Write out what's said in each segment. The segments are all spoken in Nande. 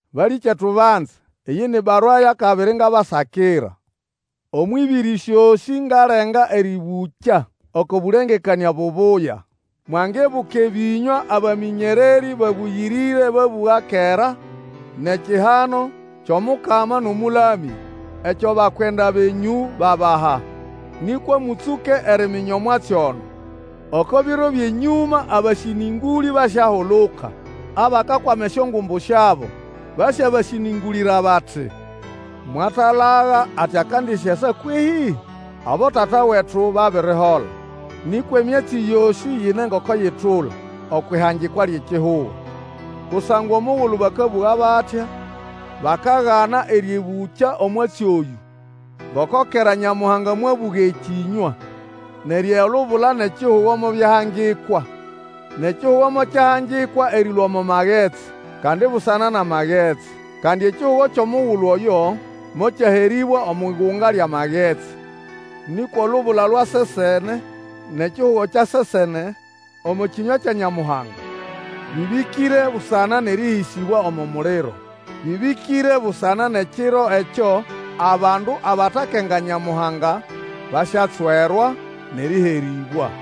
Balĩkyetu banze, eyĩ ni barua yʼakabiri ngabasakira. Omwʼĩbĩrĩ syosĩ ngalenga erĩbũkya oko bũlengekanĩa bubuya. Mwangibuka ebĩnywa abamĩnyererĩ babũyĩrĩre babũga kera, nʼekihano, kyʼomukama nʼomũlamya, ekyo abakwenda benyũ babaha. Nĩkwa mũtsũke eriminya omwatsi ono, oko biro byʼenyũma abasĩnĩngũlĩ basyahuluka, abakakwama esyongumbu syabo. Basyabasĩnĩngũlĩra bati, Mwatalaga ati akandisyasa kwehĩ? Abotata wetu babirihola, nĩkwa emyatsi yosĩ ine ngoko yitula okwʼihangikwa lyʼekihugo. Kusangwa omugulu bakabũga batya, bakagana eryĩbũkya omwatsi oyũ, ngoko kera Nyamuhanga mwabũga ekĩnywa, neryo olubula nʼekihugo mobyahangikwa. Nʼekihugo mokyahangikwa erĩlũa omo magetsi, kandi busana nʼamagetsi. Kandi ekihugo kyʼomugulu oyo mokyaherĩbwa omwʼigunga lyʼamagetsi. Nĩkwa olubula lwa sesene, nʼekihugo kya sesene, omo kĩnywa kya Nyamuhanga, bĩbĩkĩre busana nʼerĩhĩsĩbwa omo muliro. Bĩbĩkĩre busana nʼekiro ekyo abandu abatakenga Nyamuhanga basyatswerwa nʼerĩherĩbwa.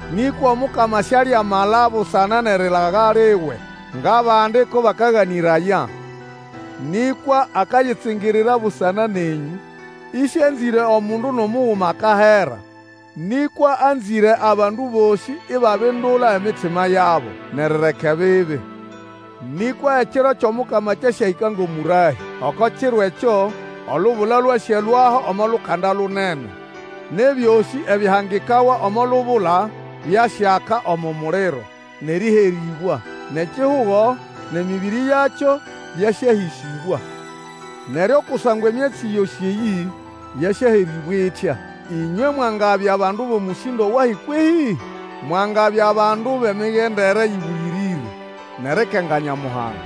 Nĩkwa Omukama sialiamala busana nʼerilaga liwe ngʼabandi ko bakaganĩraya. Nĩkwa akayitsingirira busana nenyũ, ĩsĩanzĩre omundu nʼomuguma akahera, nĩkwa anzĩre abandu bosĩ ibabindula emitima yabo nʼerireka ebibi. Nĩkwa Ekiro kyʼomukama kyasyahĩka ngʼomũrahĩ. Oko kiro ekyo, olubula lwasyalũaho omo lukanda lunene, nʼebyosĩ ebyahangikawa omo lubula byasyaka omo muliro, nʼerĩherĩbwa. Nʼekihugo nʼemĩbĩrĩ yakyo byasyahĩsĩbwa. Neryo kusangwa emyatsi yosĩ eyĩ yasyaherĩbwa itya, ĩnywe mwangabya bandu bʼomũsĩndo wahi kwehĩ? Mwangabya bandu bʼemigendere ĩbũyĩrĩre nʼerikenga Nyamuhanga.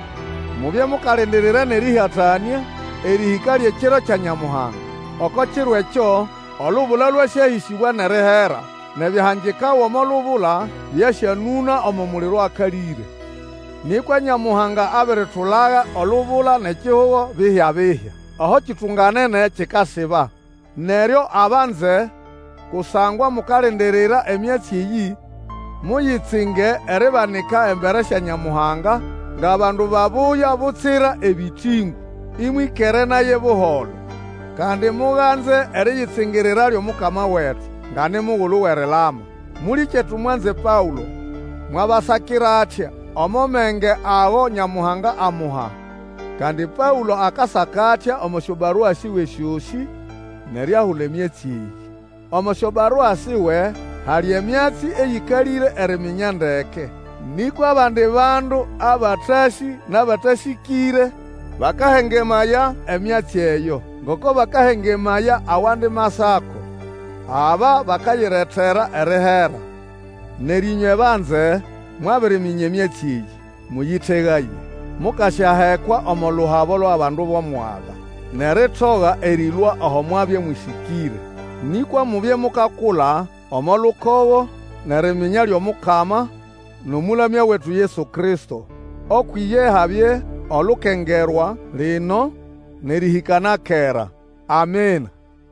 Mubye mukalindirira nʼerĩhatanĩa erĩhĩka lyʼekiro kya Nyamuhanga. Oko kiro ekyo, olubula lwasyahĩsĩbwa nʼerihera, nʼebyahangikawa omo lubula byasyanũna omo muliro akalĩre. Nĩkwa Nyamuhanga abiritulaga olubula nʼekihugo bihya-bihya, aho ekitunganene kikasiba. Neryo abanze, kusangwa mukalindirira emyatsi eyĩ, muyitsinge eribanika embere sya Nyamuhanga ngʼabandu babuya butsira ebĩtĩngũ, Ĩmwĩkere naye buholo. Kandi muganze eriyitsingirira lyʼomukama wetu nga ni mugulu wʼerilama. Mũlĩkyetu mwanze Paũlo, mwabasakira atya, omo menge ago Nyamuhanga amuha. Kandi Paũlo akasaka atya omo syobarua siwe syosĩ nʼeriahula emyatsi eyĩ. Omo syobarua siwe, hali emyatsi eyĩkalĩre eriminya ndeke. Nĩkwa abandi bandu abatasĩ nʼabatasĩkĩre bakahengemaya emyatsi eyo, ngoko bakahengemaya awandi Masako. Aba bakayiretera erihera. Neryo ĩnywe banze, mwabiriminya emyatsi eyĩ, mũyĩtegaye, mukasyahekwa omo luhabo lwʼabandu bʼomwaga, nʼeritoga erĩlũa aho mwabya mũsĩkĩre. Nĩkwa mubye mukakula omo lukogo nʼeriminya lyʼomukama nʼomũlamya wetu Yesu Kristo. Ukwʼiye habye olukengerwa, lino, nʼerĩhĩka na kera. Amina.